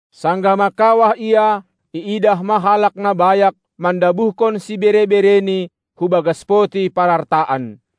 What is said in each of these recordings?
Sanggah mangkawah Ia, iidah ma halak na bayak mandabuhkon sibere-bereni hubagas poti parartaan.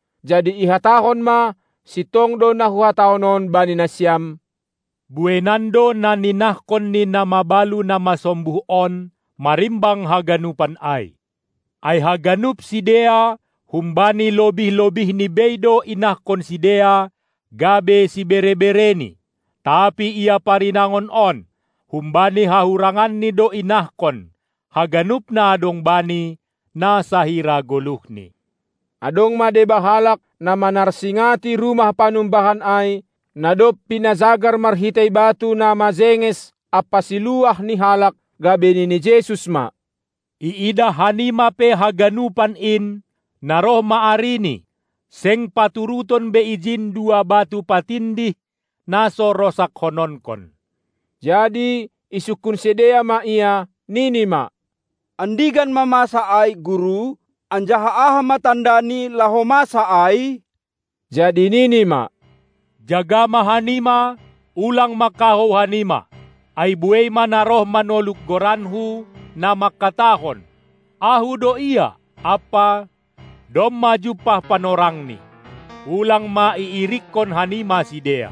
Jadi ihatahon ma: Sintong do na huhatahon on bani nasiam: Bueinan do na ninahkon ni na mabalu na masombuh on marimbang haganupan ai. Ai haganup sidea humbani lobih-lobihni bei do inahkon sidea gabe sibere-bereni, tapi ia parinangon on, humbani hahuranganni do inahkon haganup na adong bani, na sahira goluhni. Adong ma deba halak, na manarsingati rumah panumbahan ai, na dob pinajagar marhitei batu na majenges ampa siluah ni halak, gabe nini Jesus ma: Iidah hanima pe haganupan in, na roh ma arini, seng paturuton be ijin dua batu patindih, na so rosakkononkon. Jadi isungkun sidea ma Ia, nini ma: Andigan ma masa ai, Guru? Anjaha aha ma tandani, laho masa ai? Jadi Nini ma: Jaga ma hanima, ulang ma kahou hanima! Ai buei ma na roh manoluk goranKu, na mangkatahon: Ahu do Ia, ampa, "Domma jumpah panorangni". Ulang ma iirikkon hanima sidea.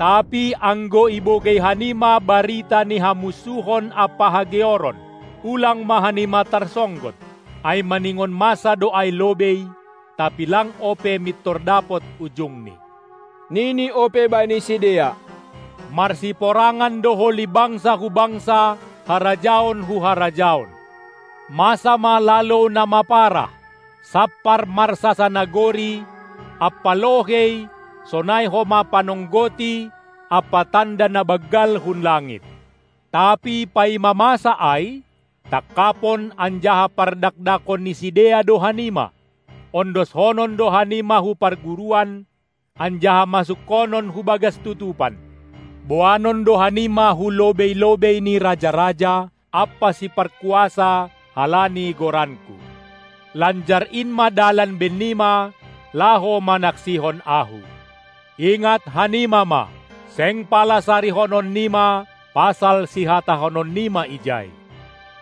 Tapi anggo ibogei hanima barita ni hamunsuhon ampa hageoron, ulang ma hanima tarsonggot, ai maningon masa do ai lobei, tapi lang ope mintor dapot ujungni. Nini ope bani sidea: Marsiporangan do holi bangsa hu bangsa, harajaon hu harajaon. Masa ma lalou na maparah, sampar marsasanagori ampa lohei sonai homa panonggoti ampa tanda na banggal hun langit. Tapi paima masa ai, tangkapon anjaha pardakdakon ni sidea do hanima. Ondoshonon do hanima hu parguruan anjaha masukkonon hubagas tutupan, boanon do hanima hu lobei-lobei ni raja-raja ampa siparkuasa halani goranKu. Lanjar in ma dalan bennima, laho manaksihon Ahu. Ingat hanima ma: Seng pala sarihonon nima pasal sihatahonon nima ijai.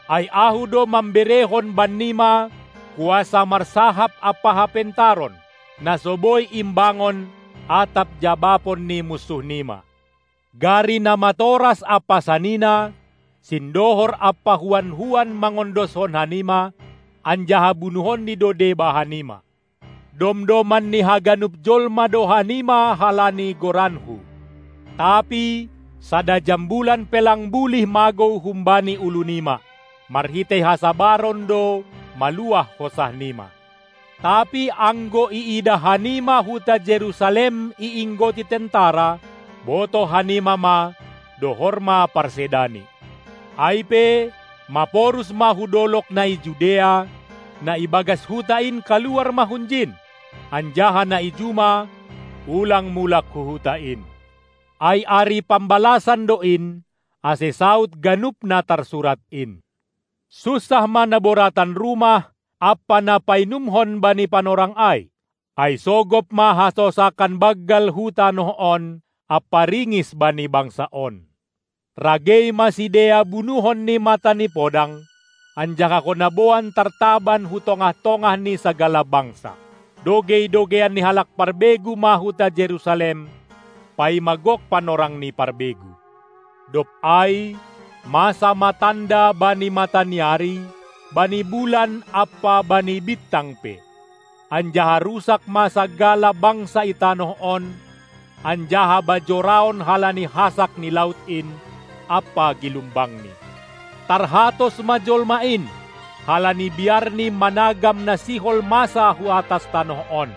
Ai Ahu do mamberehon bannima kuasa marsahap ampa hapentaron, na so boi imbangon atap jabapon ni munsuh nima. Gari namatoras ampa sanina, sindohor ampa huan-huan mangondoshon hanima; anjaha bunuhonni do deba hanima. Domdoman ni haganup jolma do hanima halani goranKu. Tapi sada jambulan pe lang bulih magou humbani ulu nima. Marhitei hasabaron do maluah hosah nima. Tapi anggo iidah hanima huta Jerusalem iinggoti tentara, botoh hanima ma, dohor ma parsedani. Ai pe maporus ma hu dolog na i Judea, na ibagas huta in kaluar ma hunjin, anjaha na i juma ulang mulak hu huta in. Ai ari pambalasan do in, ase saud ganup na tarsurat in. Sunsah ma na boratan rumah ampa ni painumhon bani panorang ai, ai sogop ma hasosakan banggal hu tanoh on ampa ringis bani bangsa on. Ragei ma sidea bunuhon ni mata ni podang, anjaha hona boan tartaban hu tongah-tongah ni sagala bangsa. Dogei-dogeian ni halak parbegu ma huta Jerusalem, paima gok panorang ni parbegu. Dob ai masa ma tanda bani mata ni ari, bani bulan ampa bani bintang pe, anjaha rusak ma sagala bangsa i tanoh on anjaha bajoraon halani hasak ni laut in ampa gilumbangni. Tarhatos ma jolma in halani biarni managam na sihol masa hu atas tanoh on,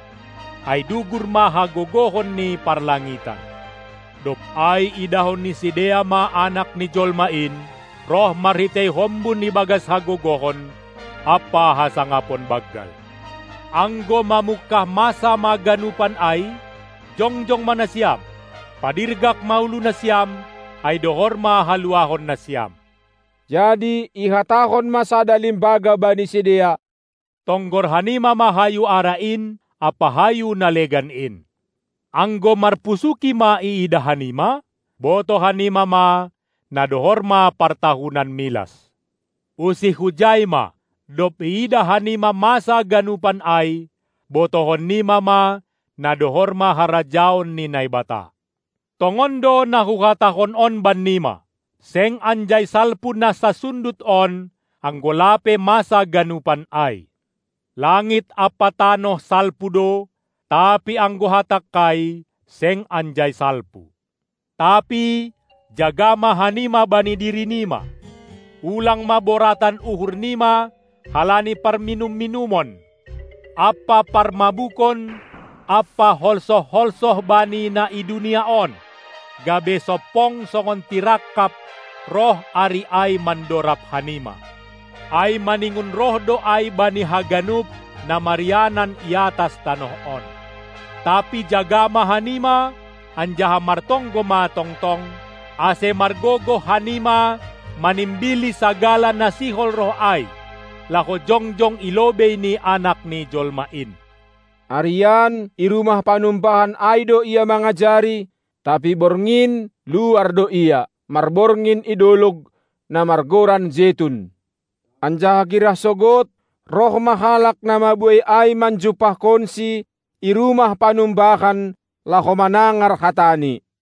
ai dugur ma hagogohon ni parlangitan. Dob ai idahon ni sidea ma Anak ni jolma in roh marhitei hombun ibagas hagogohon ampa hasangapon banggal. Anggo mamungkah masa ma ganupan ai, jongjong ma nasiam, padirgak ma ulu nasiam, ai dohor ma haluahonnasiam. Jadi ihatahon ma sada limbaga bani sidea: Tonggor hanima ma hayu ara in ampa hayu na legan in! Anggo marpusuki ma iidah hanima, botoh hanima ma, na dohor ma partahunan milas. Usih hujai ma, dob iidah hanima masa ganupan ai, botohon nima ma na dohor ma harajaon ni Naibata. Tongon do na Huhatahon on bannima: Seng anjai salpu na sansundut on, anggo lape masa ganupan ai. Langit ampa tanoh salpu do, tapi anggo hatangKai seng anjai salpu. Tapi jaga ma hanima bani diri nima, ulang ma boratan uhur nima halani parminum-minumon ampa parmabukon ampa holsoh-holsoh bani na i dunia on, gabe sompong songon tirangkap roh ari ai mandorab hanima. Ai maningon roh do ai bani haganup na marianan iatas tanoh on. Tapi jaga ma hanima anjaha martonggo ma tongtong, ase margogoh hanima manimbili sagala na sihol roh ai, laho jongjong i lobei ni Anak ni Jolma in. Arian i rumah panumbahan ai do Ia mangajari, tapi borngin luar do Ia, marborngin i dolog, na margoran Jetun. Anjaha girah sogod roh ma halak na mabuei ai manjumpahkonSi i rumah panumbahan laho manangar hataNi.